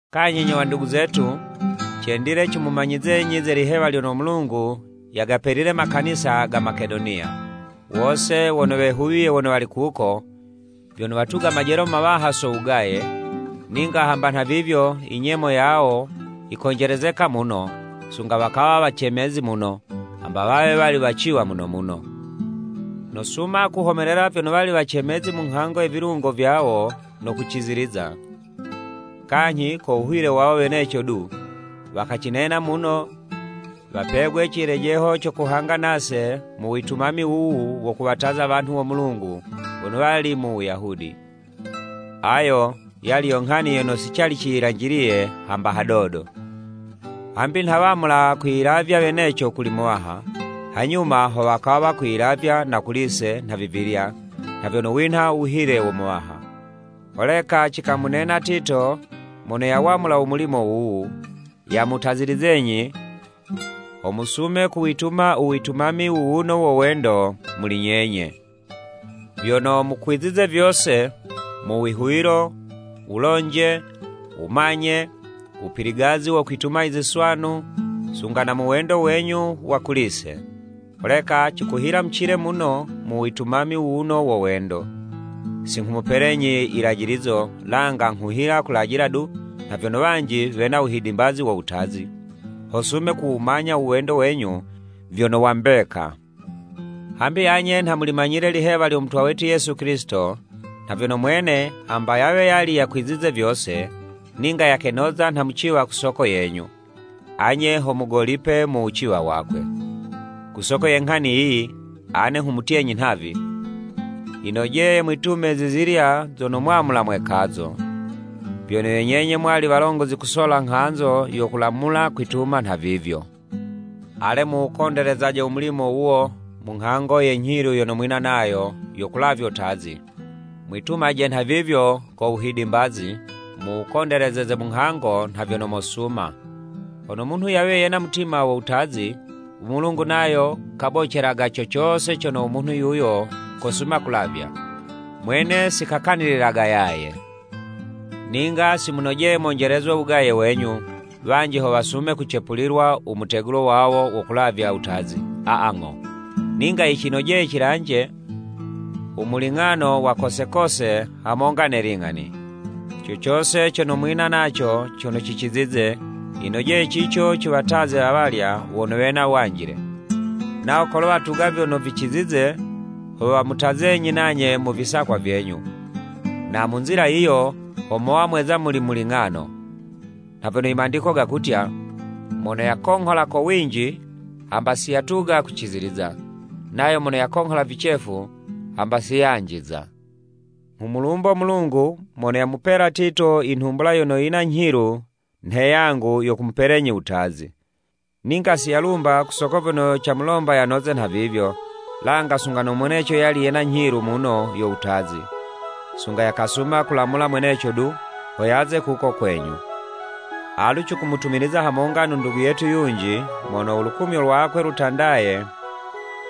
Kanyhi nyo wandugu zetu, cendile cimumanyizenyi ze lihewa lyono u Mulungu yagapelile makanisa ga Makedoniya. Wose wono wehuwiye wono wali kuko, vyono watuga majelo mawaha so wugaye, ninga hamba nhavivyo inyemo yawo yikonjelezeka muno, sunga wakawa wacemezi muno, hamba wawe wali waciwa muno muno. Nosuma kuhomelela vyono wali wacemezi mu nghango ye vilungo vyawo no kuciziliza. Kanyhi ko wuhile wawo weneco du, wakacinena muno wapegwe cilejeho co kuhanga nase mu witumami wuwu wo kuwataza wanhu wo Mulungu wono wali mu Wuyahudi. Ayo yali yo nghani yono si cali ciyilanjiliye hamba hadodo! Hambi nha wamula kwiyilavya weneco kuli Muwaha, hanyuma ho wakawa kwiyilavya na kuli'se nhavivilya nha vyono winha uwuhile wo Muwaha. Holeka cikamunena Tito mono yawamula u mulimo wuwu, yamutazilizenyi, ho musume kuwituma u witumami wuwuno wo wendo muli nyenye. Vyono mukwizize vyose, mu wihuwilo, wulonje, wumanye, wupiligazi wo kwituma i ziswanu, sunga na mu wendo wenyu wa kuli'se. Holeka, cikuhila mucile muno mu witumami wuwuno wo wendo. Si nghumupelenyi yilajilizo, langa nghuhila kulajila du nha vyono wanji wena wuhidimbazi wo wutazi, ho sume kuwumanya u wendo wenyu vyono wa mbeka. Hambi anye nha mulimanyile lihewa lyo Mutwa wetu Yesu Kilisito, nha vyono mwene hamba yawe yali yakwizize vyose, ninga yakenoza nha muciwa ku soko yenyu, anye ho mugolipile mu wuciwa wakwe. Ku soko ye nghani yiyi, ane nghumutyenyi nhavi, yinojeye mwitume zizilya zono mwamula mwekazo. Vyono yo nyenye mwali walongozi kusola nghanzo yo kulamula kwituma nhavivyo. Ale muwukondelezaje u mulimo wuwo, mu nghango ye nyhilu yono mwina nayo yo kulavyo 'tazi, mwitumaje nhavivyo ko wuhidimbazi, muwukondelezeze mu nghango nha vyono mosuma. Hono munhu yawe yena mutima wo wutazi, u Mulungu nayo kabocelaga co cose cono u munhu yuyo kosuma kulavya, Mwene si kakanililaga yaye. Ninga si munojeye monjelezwe wugaye wenyu, wanji ho wasume kucepulilwa umutegulo wawo wo kulavya wutazi, aa ng'o, ninga yicinojeye cilanje u muling'ano wa kose kose hamonga ne ling'ani. Co cose cono mwina naco cono cicizize, yinojeye cico ciwataze awalya wono wena wanjile, nawo kolo watuga vyono vicizize, ho wamutazenyi nanye mu visakwa vyenyu, na mu nzila yiyo, ho mowa mweza muli muling'ano. Nha vyono i Mandiko gakutya, “Mono yakonghola ko winji, hamba siyatuga kuciziliza, nayo mono yakonghola vicefu, hamba si yanjiza.” Nghumulumbo Mulungu mono yamupela Tito i nhumbula yono yina nyhilu nhe yangu yo kumupelenyi wutazi. Ninga si yalumba ku soko vyono camulomba yanoze nhavivyo, langa sunga no mweneco yali yena nyhilu muno yo wutazi, sunga yakasuma kulamula mweneco du, ho yaze kuko kwenyu. Alu cikumutumiliza hamonga no ndugu yetu yunji mono u lukumyo lwakwe lutandaye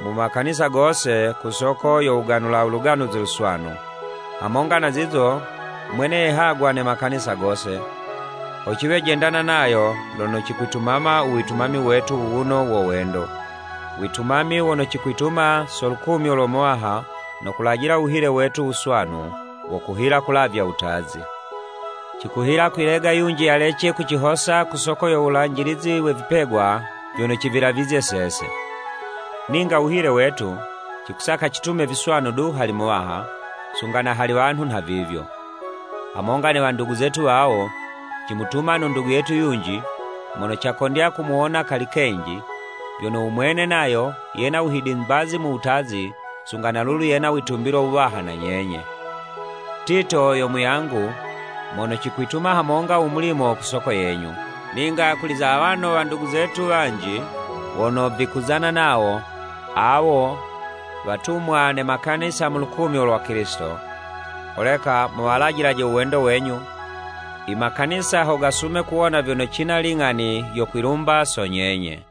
mu makanisa gose ku soko yo wuganula u Luganuzi Luswanu. Hamonga na zizo, mwene yehagwa ne makanisa gose, ho ciwe jendana nayo lono cikwitumama u witumami wetu wuwuno wo wendo, witumami wono cikwituma so lukumyo lo Muwaha no kulajila wuhile wetu wuswanu, wo kuhila kulavya wutazi. Cikuhila kwilega yunji yalece kucihosa ku soko yo wulanjilizi we vipegwa vyono civilavizye sese. Ninga wuhile wetu, cikusaka citume viswanu du hali Muwaha, sunga na hali wanhu nhavivyo. Hamonga ne wandugu zetu wawo, cimutuma no ndugu yetu yunji, mono cakondya kumuwona kali kenji, vyono u mwene nayo yena wuhidimbazi wo wutazi, sunga na lulu yena witumbilo wuwaha na nyenye. Tito yo muyangu, mono cikwituma hamonga u mulimo ku soko yenyu. Ninga kuli za awano wandugu zetu wanji wono vikuzana nawo, awo watumwa ne makanisa nu lukumyo lwa Kilisito. Holeka muwalajilaje u wendo wenyu, i makanisa ho gasume kuwona vyono cina ling'ani yo kwilumba so nyenye.